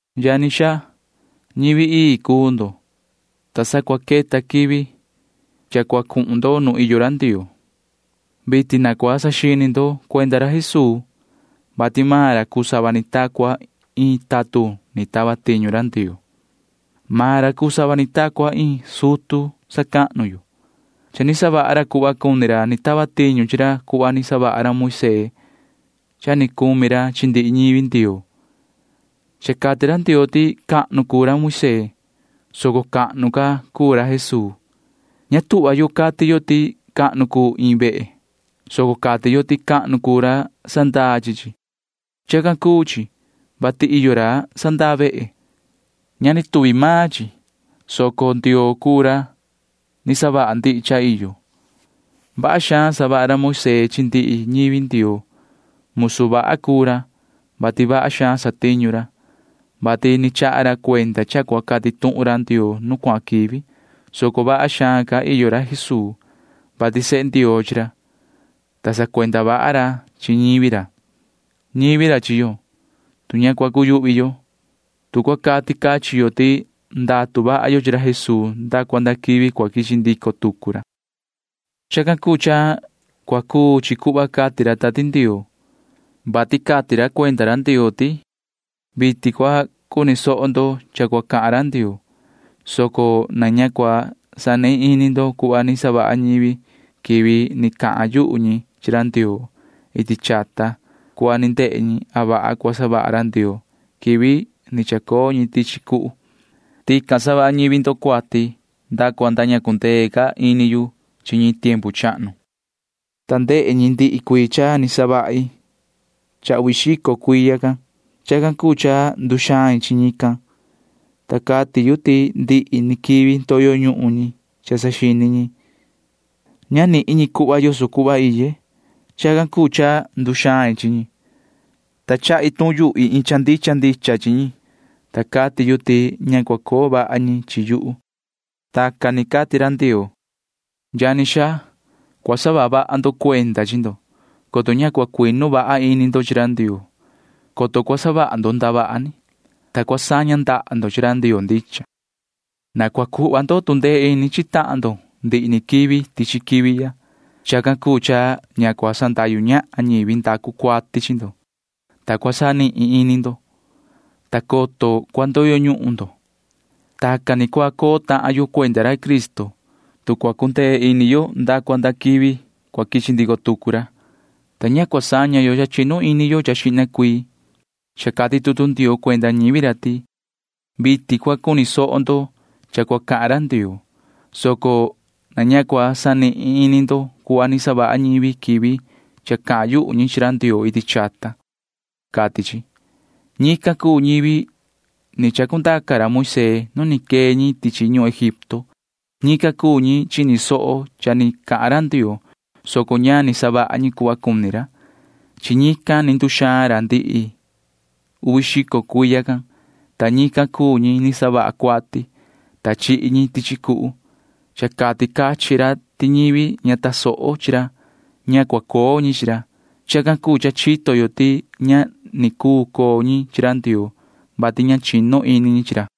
Yani xaa, ñivi ii cuu ndo, ta sa cua queta quivi cha cua cuhun ndo nu iyo ra Ndioo. Vitin na cua saxini ndo cuenda ra Jesuu, vati maan ra cuu sava ni ta cua iin tatun ni tava tiñu ra Ndioo. Maan ra cuu sava ni ta cua iin sutu sacahnu yo. Cha ni savaha ra cuhva cuni ra ni tava tiñu chi ra cuhva ni savaha ra Moisee cha ni cumi ra chi ndihi ñivi Ndioo. Cha cati ra Ndioo ti cahnu cuu ra Moisee, soco cahnu ca cuu ra Jesuu. Ña tuhva yo cati yo ti cahnu cuu iin vehe, soco cati yo ti cahnu cuu ra sandaa chi chi. Chacan cuu chi, vati iyo ra sandaa vehe. Ña ni tuvi maan chi, soco Ndioo cuu ra ni savaha ndihi cha iyo. Vaha xaan savaha ra Moisee chi ndihi ñivi Ndioo. Musu vaha cuu ra, vati vaha xaan satiñu ra, vati ni chaha ra cuenda cha cua cati tuhun ra Ndioo nu cuahan quivi, soco vaha xaan ca iyo ra Jesuu, vati sehe Ndioo chi ra, ta sacuenda vaha ra chi ñivi ra. Ñivi ra chi yo, tu ña cua cuyuhvi yo, tu cua cati cachin yo ti ndatu vaha yo chi ra Jesuu nda cua nda quivi cua quichi ndico tucu ra. Chacan cuu cha cua cuu chi cuhva cati ra Tati Ndioo, vati cati ra cuenda ra Ndioo ti: Vitin cua cuni soho ndo cha cua cahan ra Ndioo, soco na ña cua sanihin ini ndo cuhva ni savaha ñivi quivi ni cahan yuhu ñi chi ra Ndioo iti chata cuhva ni ndehe ñi a vaha cua savaha ra Ndioo quivi ni chacoo ñi tichi cuhu. Tican savaha ñivi ndo cuati nda cua nda ña cua cundee ca ini yu chi ñi tiempu chahnu, ta ndehe ñi ndihi cuii cha ni savahi cha uvi xico cuiya can. Chacan cuu cha nduxain chi ñican, ta cati yu ti ndihi ni quivi ndoyo ñuhun ñi cha saxini ñi. Ña nihin ñi cuhva yoso cuhva iye. Chacan cuu cha nduxain chi ñi, ta cahan rai yu iin cha ndicha ndicha chi ñi, ta cati yu ti ña cua coo vaha ñi chi yuhu. Tacan ni cati ra Ndioo. Yani xaa, cua saha vaha ndo cuenda chi ndo, coto ña cua cuinu vaha ini ndo chi ra Ndioo, coto cua savaha ndo ndavaha ni, ta cua saña ndaha ndo chi ra Ndioo ndicha. Na cua cuhva ndo tu ndee ini chi tahan ndo ndihi ni quivi tichi quivi ya. Chacan cuu cha ña cua sandahyu ñahan ñivi ndacu cuati chi ndo, ta cua sanihin ini ndo, ta coto cua ndoyo ñuhun ndo. Tacan ni cua coo tahan yo cuenda ra Cristo, tu cua cundee ini yo nda cua nda cua quichi ndico tucu ra, ta ña cua saña yo cha chinu ini yo cha xihna cuii. Cha cati tutu Ndioo cuenda ñivi ra ti: Vitin cua cuni soho ndo cha cua cahan ra Ndioo, soco na ña cua sanihin ini ndo cuhva ni savaha ñivi quivi cha cahan yuhu ñi chi ra Ndioo iti chata, cati chi. Ñican cuu ñivi ni chacundaca ra Moisee nu ni quee ñi tichi ñuhun Egipto. Ñican cuu ñi chini soho cha ni cahan ra Ndioo, soco ña ni savaha ñi cuhva cuni ra. Chi ñican ni nduxaan ra ndihi uvi xico cuiya can, ta ñican cuu ñi ni savaha cuati, ta chihi ñi tichi cuhu. Cha cati cachin ra ti ñivi ña tasoho chi ra―ña cua coo ñi chi ra. Chacan cuu cha chito yo ti ña ni cuu coo ñi chi ra Ndioo, vati ña chinu ini ñi chi ra.